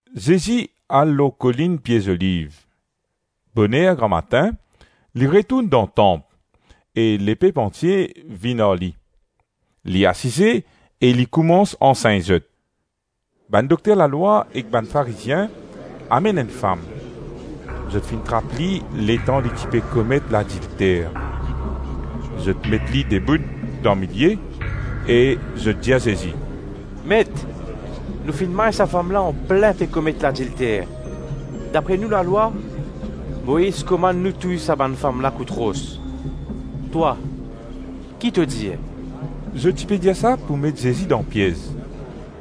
[ Zezi al lor kolinn Pie Zoliv. Boner gramatin, li retourn dan Tanp e lepep antie vinn ar li. Li asize e li koumans ansegn zot. Bann dokter lalwa ek bann Farizien amenn enn fam; zot finn trap li letan li ti pe komet ladilter. Zot met li debout dan milie e zot dir Zezi, “Met, nou finn may sa fam la anplin pe komet ladilter. Dapre nou lalwa, Moiz komann nou touy sa bann fam la kout ros; twa, ki to dir?” Zot ti pe dir sa pou met Zezi dan piez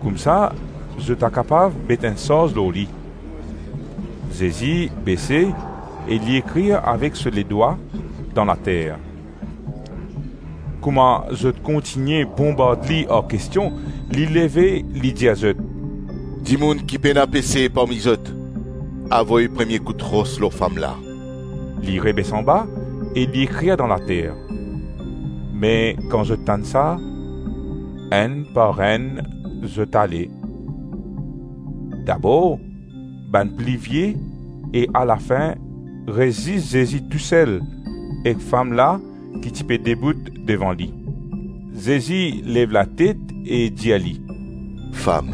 koumsa zot a kapav met enn sarz lor li. Zezi bese e li ekrir avek so ledwa dan later. Kouma zot kontigne bonbard li ar kestion, li leve, li dir zot, “Dimoun ki pena pese parmi zot, avoy premie kout ros lor fam la.” Li rebes anba e li ekrir dan later. Me kan zot tann sa, enn par enn zot ale; dabor bann pli vie e alafin res zis Zezi tou sel ek fam la ki ti pe debout devan li. Zezi lev latet e dir li, “Fam,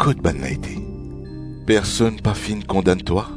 kot bannla ete? Personn pa finn kondann twa?”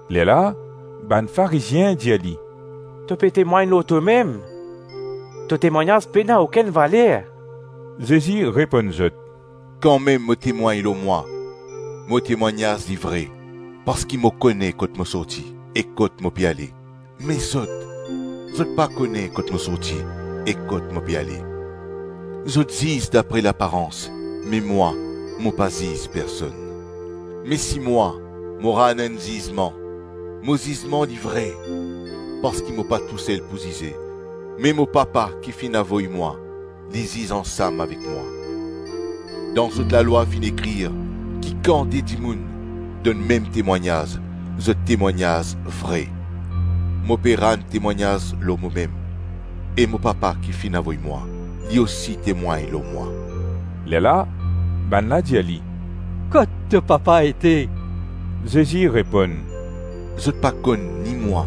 Lerla bann Farizien dir li, “To pe temwagn lor tomem, to temwagnaz pena okenn valer.” Zezi reponn zot, “Kanmem mo temwagn lor mwa, mo temwagnaz li vre parski mo kone kot mo sorti e kot mo pe ale; me zot, zot pa kone kot mo sorti e kot mo pe ale. Zot ziz dapre laparans me mwa, mo pa ziz personn. Me si mwa, mo rann enn zizman, mo zizman li vre parski mo pa tou sel pou zize, me mo Papa ki finn avoy mwa, li ziz ansam avek mwa. Dan zot lalwa finn ekrir ki kan de dimoun donn mem temwagnaz, zot temwagnaz vre. Mo pe rann temwagnaz lor momem e mo Papa ki finn avoy mwa, Li osi temwagn lor mwa.” Lerla bannla dir li, “Kot to Papa ete?” Zezi reponn, “Zot pa konn ni mwa,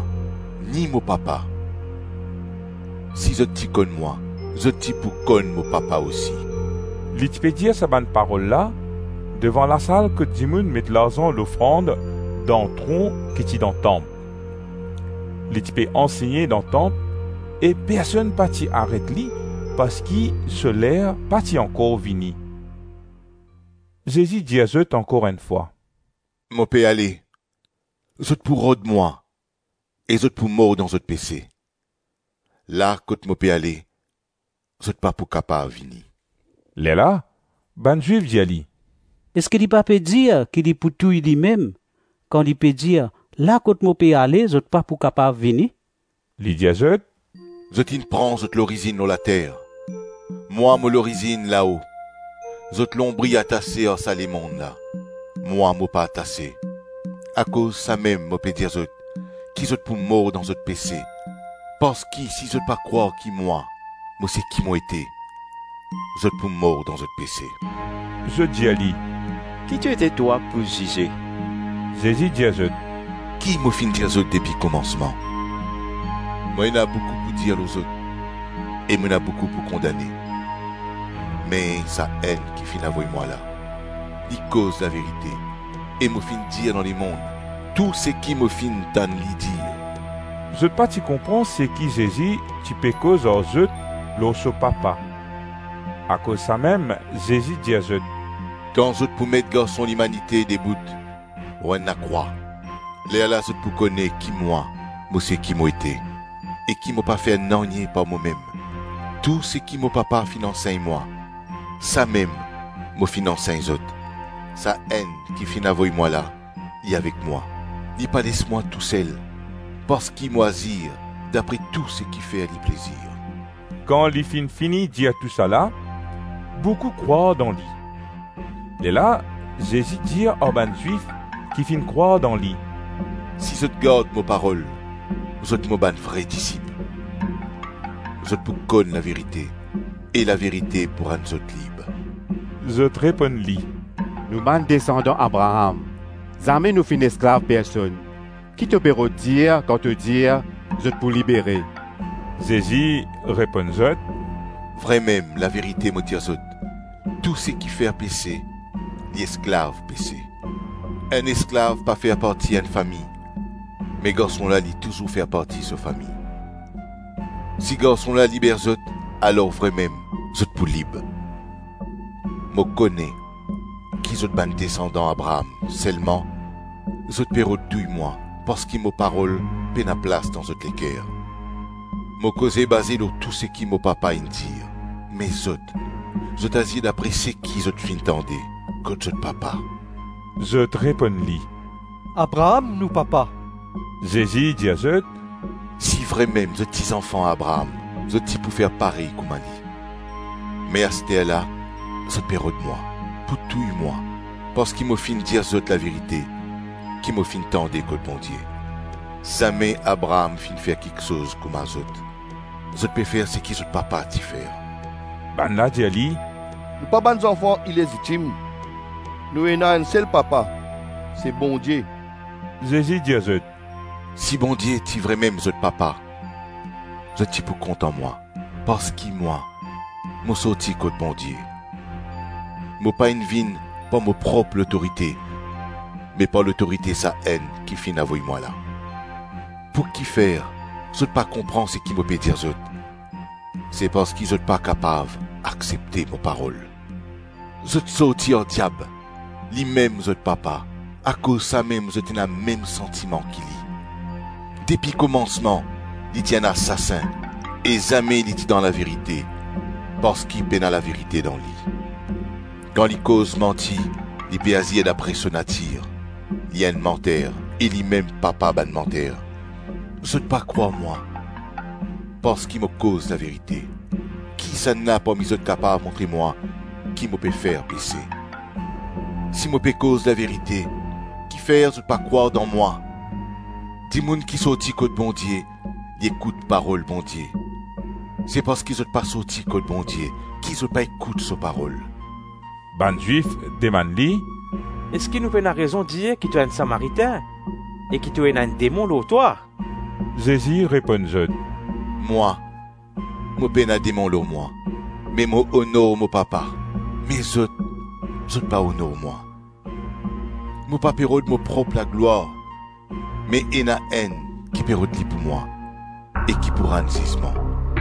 ni mo Papa; si zot ti konn mwa, zot ti pou konn mo Papa osi.” Li ti pe dir sa bann parol la, devan lasal kot dimoun met larzan lofrand dan tron ki ti dan tanp; li ti pe ansegne dan tanp e personn pa ti aret li parski so ler pa ti ankor vini. Zezi dir zot ankor enn fwa, “Mo pe ale, zot pou rod mwa e zot pou mor dan zot pese; la kot mo pe ale, zot pa pou kapav vini.” Lerla bann Zwif dir li, “Eski li pa pe dir ki li pou touy limem, kan li pe dir ‘La kot mo pe ale zot pa pou kapav vini’?” Li dir zot, “Zot inn pran zot lorizinn lor later, mwa mo lorizinn lao; zot lonbri atase ar sa lemonn la, mwa mo pa atase. Akoz samem mo pe dir zot, ki zot pou mor dan zot pese; parski si zot pa krwar ki mwa, mo seki Mo ete, zot pou mor dan zot pese.” Zot dir li, “Ki to ete twa, e pou zize?” Zezi dir zot, “Ki mo finn dir zot depi komansman? Mo ena boukou pou dir lor zot e mo ena boukou pou kondane; me Sa-Enn ki finn avoy mwa la, li koz laverite e mo finn dir dan lemonn, tou seki mo finn tann li dir.” Zot pa ti konpran seki Zezi ti pe koz ar zot lor so Papa. Akoz samem Zezi dir zot, “Kan zot pou met Garson Limanite debout lor enn lakrwa, lerla zot pou kone ki Mwa, mo seki mo ete, e ki mo pa fer nanye par momem. Tou seki mo Papa finn ansegn mwa, samem mo finn ansegn zot. Sa-Enn ki finn avoy mwa la, li avek mwa, li pa les mwa tou sel, parski mo azir dapre tou seki fer li plezir.” Kan li finn fini dir tousala, boukou krwar dan li. Lerla Zezi dir ar bann Zwif ki finn krwar dan li, “Si zot gard mo parol, zot mo bann vre disip, Zot pou konn laverite e laverite pou rann zot lib.” Zot reponn li, “Nou bann desandan Abraam; zame nou finn esklav personn; ki to pe rod dir, kan to dir, ‘Zot pou libere’?” Zezi reponn zot, “Vremem, laverite mo dir zot, tou seki fer pese, li esklav pese, Enn esklav pa fer parti enn fami, me garson la, li touzour fer parti so fami. Si Garson la liber zot, alors vremem zot pou lib. Mo kone ki zot bann desandan Abraam selman zot pe rod touy mwa parski mo parol pena plas dan zot leker. Mo koze baze lor tou seki mo Papa inn dir, me zot, zot azir dapre seki zot finn tande kot zot papa.” Zot reponn li, “Abraam nou papa.” Zezi dir zot, “Si vremem zot ti zanfan Abraam, zot ti pou fer parey kouma li. Me asterla, zot pe rod mwa, pou touy mwa parski mo finn dir zot laverite ki mo finn tande kot Bondie; zame Abraam finn fer kiksoz kouma zot. Zot pe fer seki zot papa ti fer.” Bannla dir li, “Nou pa bann zanfan ilezitim; nou ena enn sel papa, se Bondie.” Zezi dir zot, “Si Bondie ti vremem zot Papa, zot ti pou kontan mwa, parski mwa, mo sorti kot Bondie. Mo pa inn vinn par mo prop lotorite me par lotorite Sa-Enn ki finn avoy mwa la. Pou ki fer, zot pa konpran seki mo pe dir zot? Se parski zot pa kapav aksepte mo parol. Zot sorti ar diab. Limem zot papa; akoz samem zot ena mem santiman ki li. Depi komansman li ti enn asasin e zame li ti dan laverite parski pena laverite dan li; kan li koz manti, li pe azir dapre so natir; li enn manter e limem papa bann manter. Zot pa krwar mwa, parski mo koz laverite. Kisannla parmi zot kapav montre mwa ki mo pe fer pese? Si mo pe koz laverite, ki fer zot pa krwar dan mwa? Dimoun ki sorti kot Bondie, li ekout parol Bondie; se parski zot pa sorti kot Bondie ki zot pa ekout so parol.” Bann Zwif demann li, “Eski nou pena rezon dir ki to enn Samaritin e ki to ena enn demon lor twa?” Zezi reponn zot, “Mwa, mo pena demon lor mwa me mo onor mo Papa, me zot, zot pa onor mwa. Mo pa pe rod mo prop laglwar me ena Enn ki pe rod li pou mwa e ki pou rann zizman.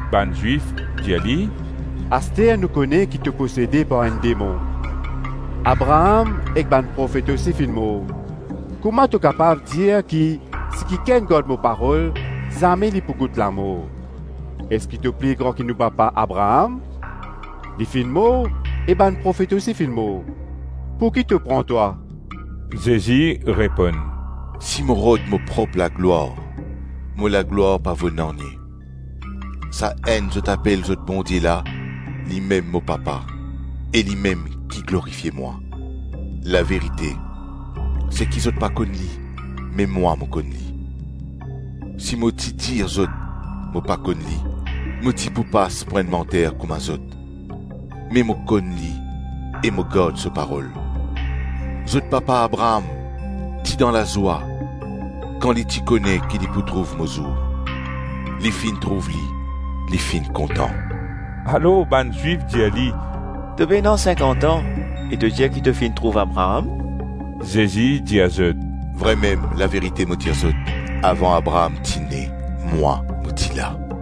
Bann Zwif dir li, “Aster nou kone ki to posede par enn demon; Abraam ek bann profet osi finn mor; kouma to kapav dir ki ‘Si kikenn gard mo parol, zame li pou gout lamor.’ Eski to pli gran ki nou papa Abraam? Li finn mor e bann profet osi finn mor; pouki to pran twa?” Zezi reponn, “Si mo rod mo prop laglwar, mo laglwar pa vo nanye; Sa-Enn zot apel zot Bondie la, limem mo Papa e limem ki glorifie mwa. Laverite, se ki zot pa konn li me mwa mo konn li. Si mo ti dir zot mo pa konn li, mo ti pou pas pou enn manter kouma zot; me mo konn li e mo gard so parol. Zot papa Abraam ti dan lazwa kan li ti kone ki li pou trouv mo zour. Li finn trouv li, li finn kontan.” Alor bann Zwif dir li, “To pena sinkant-an e to dir ki to finn trouv Abraam?” Zezi dir zot, “Vremem, laverite mo dir zot, avan Abraam ti ne, mwa, mo ti la.”